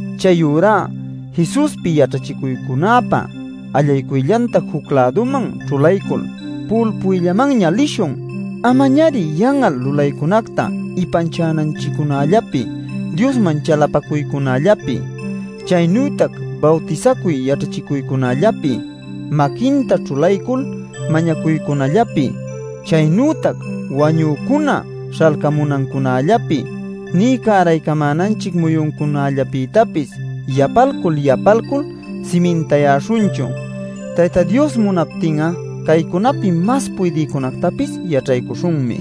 Chayurá Jesuspi yaćhachicuycunäpa allaycuyllanta juc-läduman ćhulaycul pu'ulpuymanña lishun. Amañari yan'al lulaycunacta ipanchananchiccunällapi, Diosman chalapacuycunällapi, chaynütac bawtisacuy yaćhachicuycunällapi, maquinta ćhulaycul mañacuycunällapi, chaynütac wañücuna śhalcamunancunällapi, nï cäraycamänanchic muyuncunallapïtapis yapalcul yapalcul simintayäśhunchu. Tayta Dios munaptin'a caycunapi mas puydïcunätapis yaćhaycuśhunmi.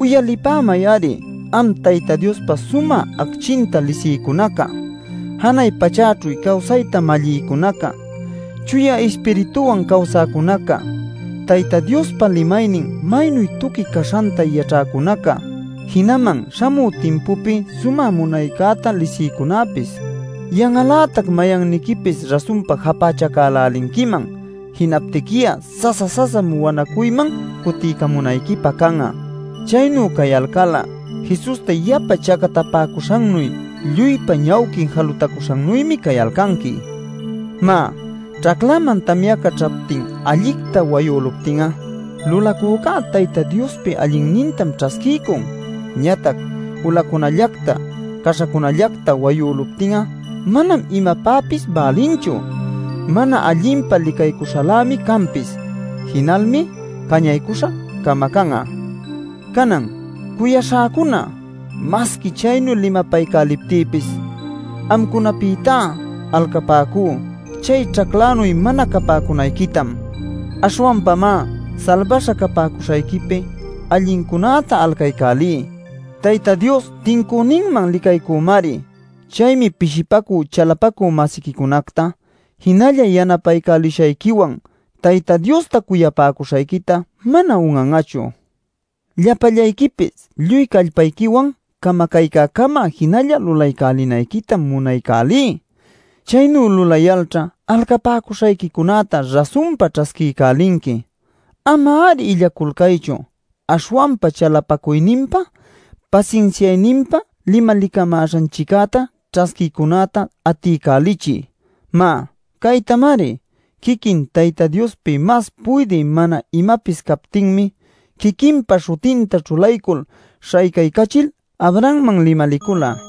Uyalipämay-ari am Tayta Diospa sumä acchinta lisïcunaca, janay pachäćhu cawsayta mallïcunaca, chuya Ispirituwan cawsäcunaca, Tayta Diospa limaynin maynu tuqui caśhanta yaćhäcunaca, jinaman śhamü timpupi sumä munaycäta lisïcunäpis. Yan'al-lätac mayanniquipis rasunpa japächacälälinquiman. Jinaptiqui'a sasa-sasam wanacuyman cutiycamunayquipä can'a. Chaynu cayalcal'a Jesusta yapa chacatapäcuśhannuy lluypa ñawquin jalutacuśhannuymi cayalcanqui. Má, ćhaclaman tamyaca ćhaptin allicta wayüluptin'a lulacüca Tayta Diospi allinnintam ćhasquiycun. Ñatac ulacunallacta caśhacunallacta wayüluptin'a manam imapäpis bälinchu; mana allinpa licaycuśhalämi canpis. Jinalmi cañaycuśha camacan'a. Canan, cuyaśhäcuna, masqui chaynu limapaycäliptïpis, amcunapïtá alcapäcú chay ćhaclanuy mana capäcunayquitam. Aśhwanpamá salbaśha capäcuśhayquipi allincunäta alcaycälí. Tayta Dios tincüninman licaycümari. Chaymi pishipacü chalapacü-masiquicunacta jinalla yanapaycälishayquiwan Tayta Diosta cuyapäcuśhayquita mana un'an'achu. Llapallayquipis lluy callpayquiwan camacaycäcama jinalla lulaycälinayquitam munaycälí. Chaynu lulayalćha alcapäcuśhayquicunäta rasunpa ćhasquiycälinqui. Ama-ari illaculcaychu; aśhwanpa chalapacuyninpa, pasinsiayninpa limalicamäśhanchiccäta ćhasquïcunäta atiycälichiy. Má, caytamari. Quiquin Tayta Diospi mas puydï mana imapis captinmi quiquinpa śhutinta ćhulaycul śhaycaycachil Abrahamman limalicula: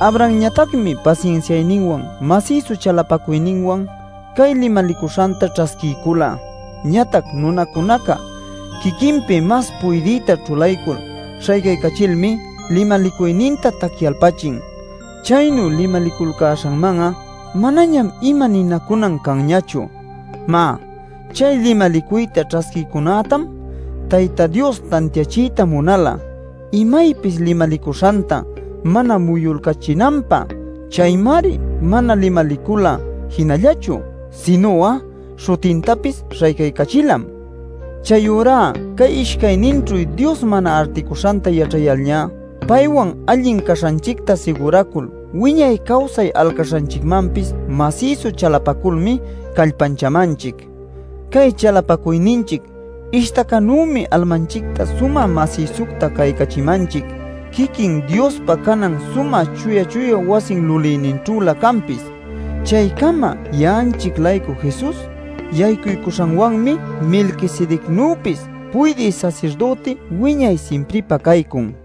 Abrahamñatacmi pasinsiayninwan masïsu chalapacuyninwan cay limalicuśhanta ćhasquiycula. Ñatac nunacunaca quiquinpi mas puydïta ćhulaycul śhaycaycachilmi limalicuyninta tacyalpachin. Chaynu limaliculcäśhanman'a manañam ima ninacunan canñachu. Má, chay limalicuyta ćhasquïcunätam Tayta Dios tantiachiyta munala imaypis limalicuśhanta mana muyulcachinanpä. Chaymari mana limalicula jinallachu, sinu'a śhutintapis śhaycaycachilam Chayurá cay ishcayninćhu Dios mana articuśhanta yaćhayalñá, paywan allin caśhanchicta siguracul wiñay cawsay alcaśhanchicmanpis masïsu chalapaculmi callpanchämanchic. Cay chalapacuyninchic ishtacanümi almanchicta sumä masïsucta caycachimanchic quiquin Diospa canan sumä chuya chuya wasi lulïninćhülä canpis. Chaycama ya'anchic-laycu Jesus yaycuycuśhanwanmi Melquisedecnüpis puydï sasirdüti wiñay simpripä caycun.